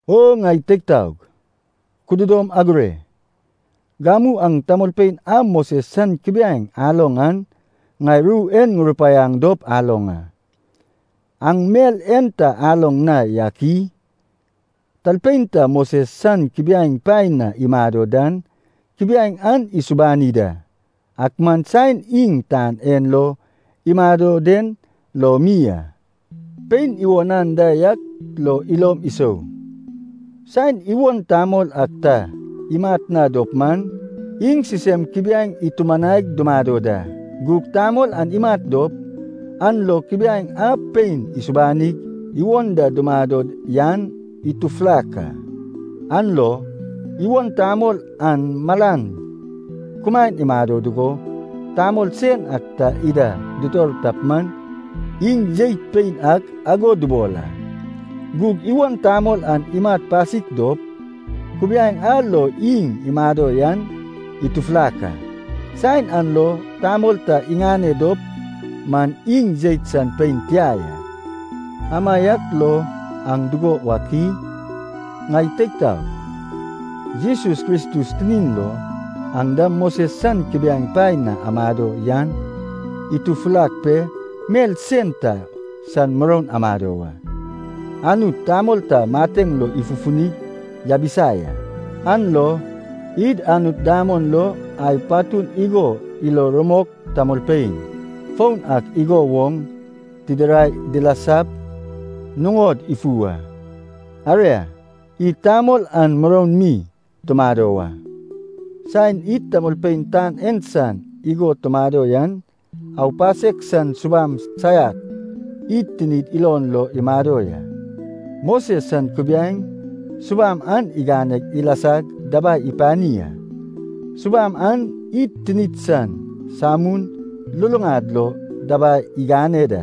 O ŋai teig taog, kududom agure. Gamu aŋ tamolpein a Moses san kubiaeŋ aloŋ an, ŋai ru en ŋurupaiaŋ dop aloŋ a. Aŋ mel en ta aloŋ na yak i? Talpein ta Moses san kubiaeŋ paen na imado dan, kubiaeŋ an isubani da, ak man saen iŋ tan en lo imado den lo mi a. Pein iwon anda yak lo ilom isou, saen iwon tamol ak ta imat na dop man, iŋ sisem kubiaeŋ itumanaig dumado da. Gug tamol an imat dop, an lo kubiaeŋ a pein isubanig iwon da dumado yan itufulak a. An lo, iwon tamol an malan kumaen imado dugo, tamol sen ak ta ida ditor tap man, iŋ jeit pein ak ago dubol a. Gug iwon tamol an imat pasik dop, kubiaeŋ a lo iŋ imado yan itufulak a. Saen an lo tamol ta iŋane dop man, iŋ jeit san pein tia ya. Amaiak lo aŋ dugo wak i? Ŋai teig taog, Jesus Kristus tinin lo, aŋ dam Moses san kubiaeŋ paen na amado yan atufulak pe mel sen ta san muroun amado wa. Anut tamol ta mateŋ lo ifufunig yabisa ya, an lo id Anut damon lo ai patun igo ilo rumok tamolpein foun ak igo woŋ tidirai dilasap nuŋod ifu wa. Aria, id tamol an muroun mi tumado wa. Saen id tamolpein tan en san igo tumado yan, aupasek san subam saiak id tinid ilon lo imado ya. Moses san kubiaeŋ subam an igane ilasag dabai ipani a. Subam an id tinid san samun luluŋad lo dabai igane da,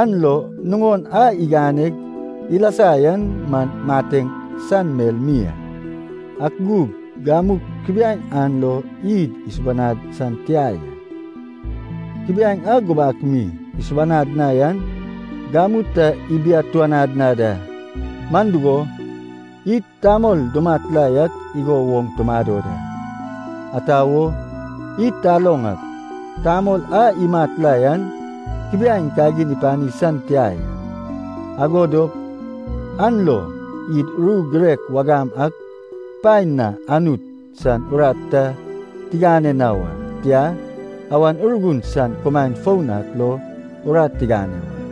an lo nuŋon a iganeg ilasa yan man mateŋ san mel mi a. Ak gug gamu kubiaeŋ an lo id isubanad san tia ya. Kubiaeŋ a gubak mi isubanad na yan gamu ta ibiatuanad na da, man dugo, id tamol dumat la yak igo woŋ tumado da. Ata wo, id taloŋ ak tamol a imat la yan kubiaeŋ kagin ipani san tia ya. Ago dop an lo id ru girek wagam ak paen na Anut san urat ta tigane na wa, tia, Awan Urgun san kumaen foun ak lo urat tigane wa.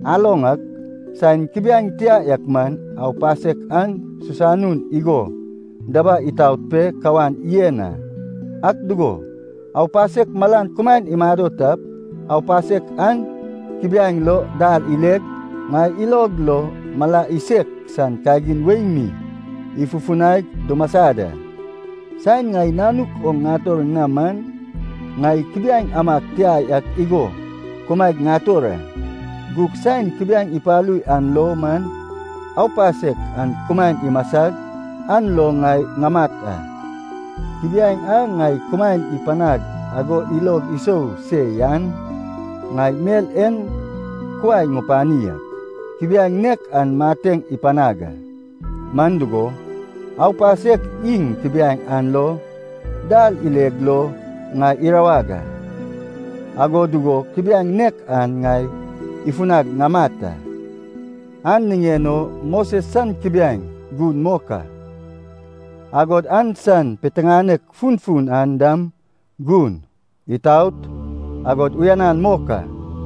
Aloŋ ak, saen kubiaeŋ tia yak man, aupasek an susanun igo dabai itaot pe kawan yen a. Ak dugo, aupasek malan kumaen imado tap, aupasek an kubiaeŋ lo dal ileg, ŋai ilog lo mala isek san kagin wei mi ifufunaig dumasa da. Saen ŋai nanuk oŋ ŋator na man, ŋai kubiaeŋ amag tia yak igo kumaeg ŋator a. Gug saen kubiaeŋ ipalu yan lo man, aupasek an kumaen imasag, an lo ŋai ŋamat a. Kubiaeŋ a ŋai kumaen ipanag ago ilog isou se yan, ŋai mel en kuai ŋupani ak, kubiaeŋ nek an mateŋ ipanag a. Man dugo, aupasek iŋ kubiaeŋ an lo dal ileg lo ŋai irawag a, ago dugo kubiaeŋ nek an ŋai ifunag ŋamat a. An niŋen o Moses san kubiaeŋ gun mok a. Agod an san piteŋanek funfun an dam gun, itaot, agod uyanan mok a.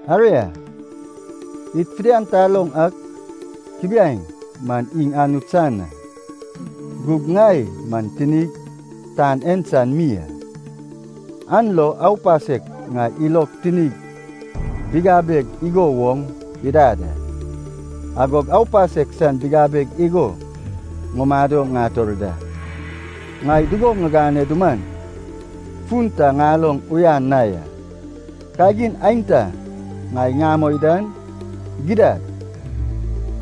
Aria, id fidian taloŋ ak kubiaeŋ man iŋ Anut san a. Gug ŋai man tinig tan en san mi a. An lo aupasek ŋai ilog tinig bigabeg igo woŋ idad a, agog aupasek san bigabeg igo ŋumado ŋator da. Ŋai dugo ŋigane duman, fun ta ŋaloŋ uyan na ya. Kagin aenta ŋai ŋamoi dan, gidad,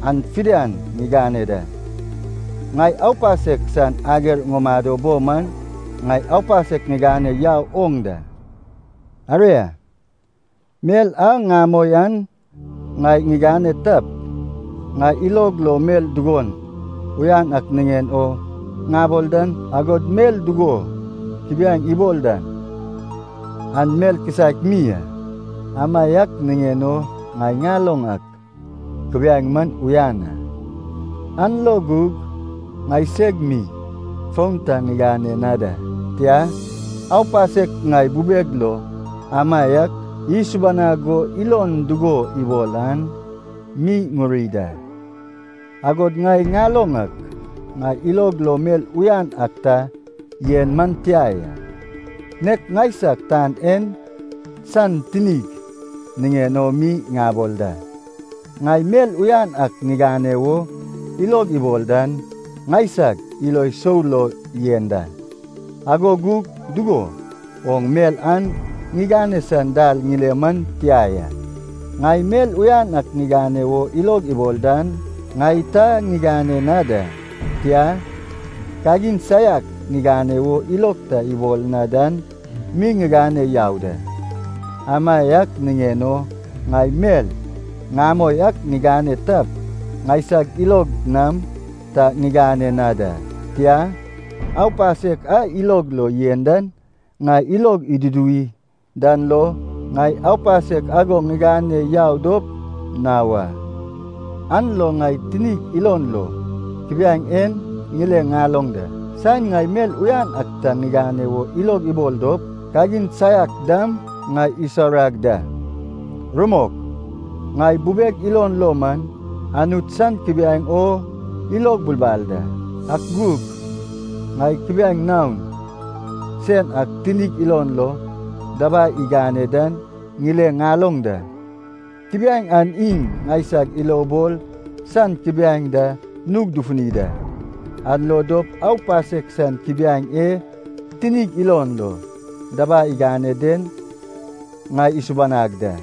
an fidian ŋigane da. Ŋai aupasek san ager ŋumado bo man ŋai aupasek ŋigane yau oŋ da. Aria, mel a ŋamoi an ŋai ŋigane tap, ŋai ilog lo mel dugo uyan ak niŋen o ŋabol dan, agod mel dugo kubiaeŋ ibol dan, an mel kisaek mi a. Amaiak niŋen o ŋai ŋaloŋ ak kubiaeŋ man uyan a. An lo gug, ŋaiseg mi fon ta ŋigane na da, tia, aupasek ŋai bubeg lo amaiak isubanag go ilon dugo ibol an mi ŋuri da. Agod ŋai ŋaloŋ ak, ŋai ilog lo mel uyan ak ta yen man tia ya. (Nek ŋaisag tan en san tinig niŋen o mi ŋabol da.) Ŋai mel uyan ak ŋigane wo ilog ibol dan ŋaisag ilo sou lo yen da, ago gug dugo woŋ mel an ŋigane san dal ŋile man tia ya. Ŋai mel uyan ak ŋigane wo ilog ibol dan ŋai ta ŋigane na da. Tia, kagin saiak ŋigane wo ilog ta ibol na dan mi ŋigane yau da. Amaiak niŋen o ŋai mel ŋamoi ak ŋigane tap, ŋaiseg ilog nam ta ŋigane na da, tia, aupasek a ilog lo yen dan, ŋai ilog iduduwi dan lo, ŋai aupasek ago ŋigane yau dop na wa. An lo ŋai tinig ilon lo kubiaeŋ en ŋile ŋaloŋ da, saen ŋai mel uyan ak ta ŋigane wo ilog ibol dop, kagin saiak dam ŋai isaurag da. Rumok, ŋai bubeg ilon lo man, Anut san kubiaeŋ o ilog bulbal da. Ak gug, ŋai kubiaeŋ naon sen ak tinig ilon lo dabai igane dan ŋile ŋaloŋ da. Kubiaeŋ an iŋ ŋaisag ilobol san kubiaeŋ da nug dufuni da. An lo dop aupasek san kubiaeŋ e tinig ilon lo dabai igane den ŋai isubanag da.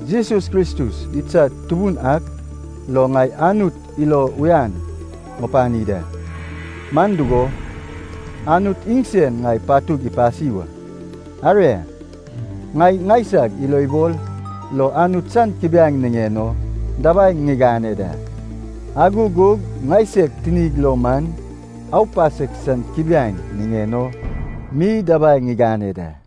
Jesus Kristus idsad Tubun ak lo ŋai Anut ilo uyan ŋupani da, man dugo, Anut iŋsen ŋai patug ipasi wa. Aria, ŋai ŋaisag ilobol lo Anut san kubiaeŋ niŋen o dabai ŋigane da, ago gug ŋaiseg tinig lo man aupasek san kubiaeŋ niŋen o mi dabai ŋigane da.